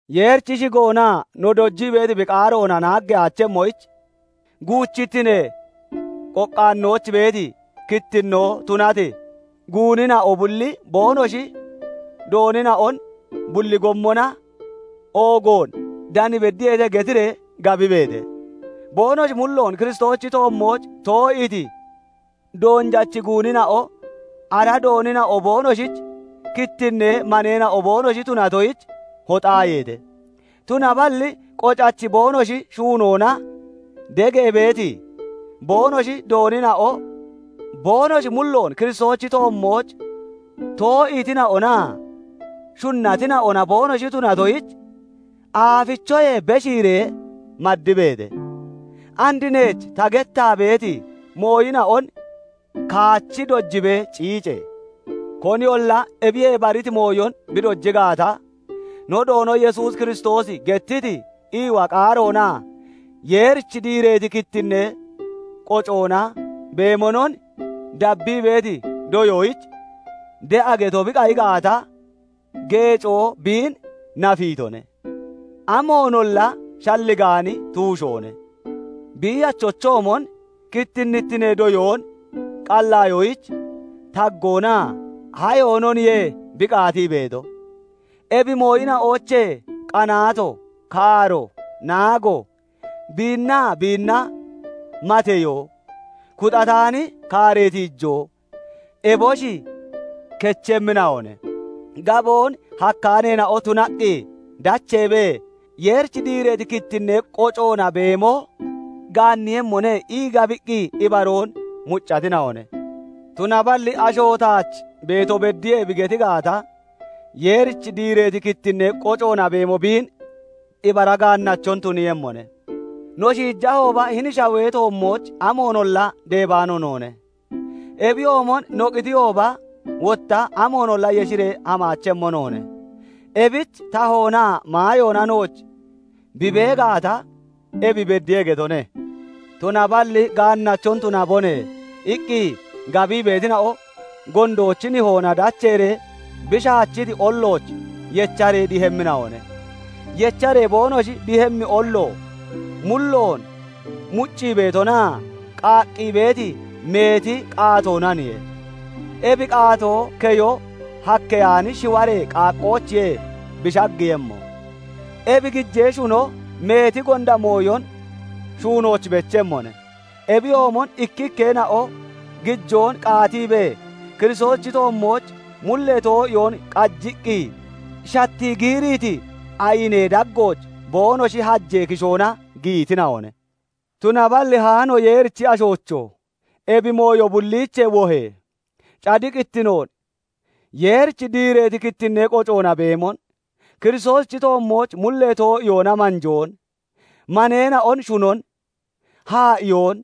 Yeerichi shigoonaa no dojii beeti bi qaaroona naaggeyaachemmoyich, guuchittinee qoqqaanooch beeti, kittinnoo tunati guunina'o bulli boonoshi doonina'on "Bulli gommona oogoon dan beddiyeete" getiree gabibeete. Boonoshi mulloon Kiristoosichi toommooch too'iiti doonjachi guunina'o, ara doonina'o boonoshich kittinnee maneena'o boonoshi tunatoyich hoxaayeete; tunaballi qocachi boonoshi shuunoona degee beeti boonoshi doonina'o boonoshi mulloon Kiristoosichi toommooch too'iitina'onaa shunnatina'ona boonoshi tunatoyich, aafichoyee beshiiree maddibeete. And neech ta gettaa beeti mooyina'on kaachi dojibee ciice! Koniyolla ebiyee bariti mooyon bi doji gaata, no Doono Yesuus Kiristoosi gettiti iiwa qaaroonaa Yeerich diireeti kittinnee qocoona beemonon dabbii beeti doyoyich de'a geto bi qayi gaata, geecoo biin nafiitone; amoonolla shalligaani tuushoone; biiyachochoomon kittinnittinee doyoon qallaayoyich taggoonaa hayoononiye (naboononiye) bi qaatii beeto. Ebi mooyina'oochee qanaato, kaaro, naago, biinnaa biinna mateyoo, kuxataani kaaree tiijoo, eboshi kechemmina'one. Gaboon hakkaaneena'o tunaqqi dacheebee, "Yeerich diireeti kittinnee qocoona beemo gaanniiyemmone" ii gabiqqi ibaroon muccatina'one. Tunaballi asho Taach beeto beddiye bi geti gaata, Yeerich diireeti kittinnee qocoona beemo biin ibara gaannachon tuniiyemmone. No shiijahooba hini shawee toommooch amoonolla deebaano noone; ebiyoomon no qitiyooba wotta, amoonolla yeshiree hamaachemmo noone; ebich "Tahoonaa maayoona nooch bi bee gaata, ebi beddiye" getone. Tunaballi "Gaannachon tunabone" iqqi gabii beetina'o gondoochi nihoona dacheeree bi shaachiti ollooch yecharee dihemmina'one; yecharee boonoshi dihemmi ollo, mulloon muccii beetonaa qaaqqi beeti meeti qaatoonaniye; ebi qaatoo keyo hakkeyaani shiwaree qaaqqoochiye bi shaggiiyemmo. Ebi gijee shuno meeti gonda mooyon shuunooch bechemmone; ebiyoomon ikkikkeena'o gijoon qaatiibee, Kiristoosichi toommooch mullee too'iyoon qajiqqi shattii giiriti ayinee daggooch boonoshi hajee kishoona giyitina'one. Tunaballi haano Yeerichi ashoocho! Ebi mooyo bulliichee wohe! Cadiqittinoon, Yeerich diireeti kittinnee qocoona beemon, Kiristoosichi toommooch mullee too'iyoona manjoon, maneena'on shunon, haa'iyoon,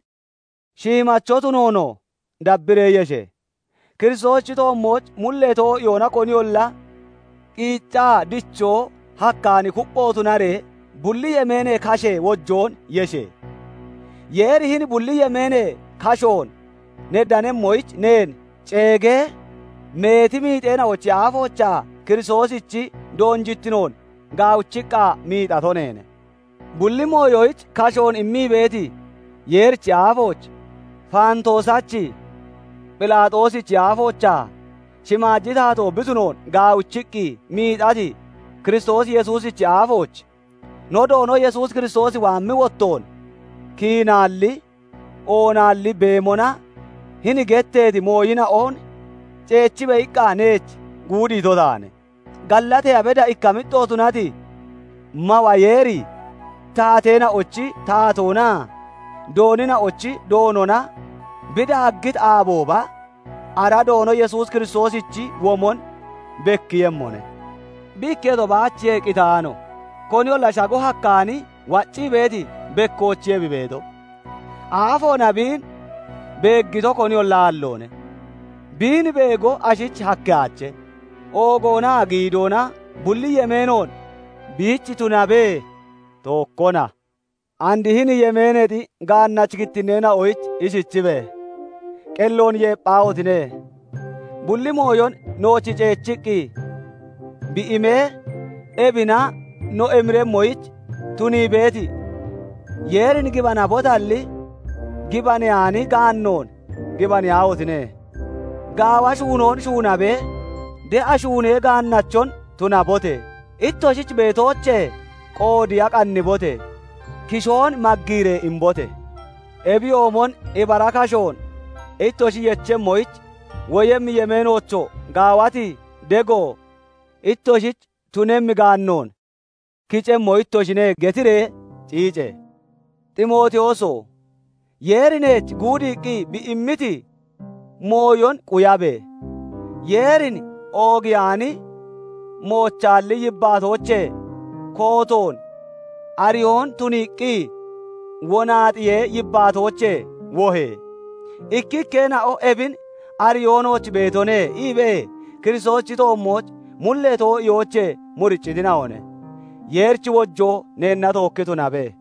shiimacho tunoonoo dabbiree yeshe! Kiristoosichi toommooch mullee too'iyoona koniyolla qiiccaa dichoo hakkaani kuppho tunaree, bulli yemeenee kashee wojoon yeshe! Yeeri hini bulli yemeenee kashoon ne danemmoyich neen ceegee, meeti miixeena'ochi aafoochaa Kiristoosichi doonjittinoon gaawichiqqa miixato neene. Bulli mooyoyich kashoon immii beeti Yeerichi aafooch, Faantoosachi Phelaaxoosichi aafoochaa Shimaaji Taatoo bi tunoon gaawichiqqi miixati Kiristoos Yesuusichi aafooch, "No Doono Yesuus Kiristoosi waammi wottoon kiinaalli, oonaalli beemona hini getteeti mooyina'on ceechibe!" iqqa neech guudiito taane. Gallateeya beda ikka mixxo tunati Mawa Yeeri, taateena'ochi Taatoonaa doonina'ochi Doonona bi daaggiti aabooba ara Doono Yesuus Kiristoosichi womon bekkiiyemmone. Bi ikketo baachiye qitaano; koniyolla shago hakkaani waccii beeti bekkoochiye bi beeto; aafoona biin beeggito koniyolla aalloone; biin beego ashich hakkeyaache. Oogoonaa giidoona bulli yemeenoon biich tunabe; tookkona. And hini yemeeneexi gaannachi kittinneena'oyich ishichibe! Qelloon yeepphaahotine! Bulli mooyon nooch ceechiqqi bi imee, ebina no emiremmoyich tunii beeti Yeerin gibanabotalli, gibaneyaani gaannoon gibaniyaahotine! Gaawa shuunoon shuunabee, de'a shuunee gaannachon tunabote! Ittoshich beetoochee qoodiya qannibote! Kishoon maggiiree imbote! Ebiyoomon ibara kashoon ittoshi yechemmoyich, woyemmi yemeenoochoo gaawati dego ittoshich tunemmi gaannoon kicemmo ittoshine getiree ciice! Ximootiyooso! Yeeri neech guudiiqqi bi immiti mooyon quyabe! Yeerin oogiyaani moochaalli yibbaatoochee, kootoon ariyoo tuniiqqi wonaaxiyee yibbaatoochee wohe! Ikkikkeena'o ebin "Ariyoo nooch beetone" iibee, Kiristoosichi toommooch mullee too'iyoochee muriccitina'one. Yeerichi wojoo neenna tookki tunabe.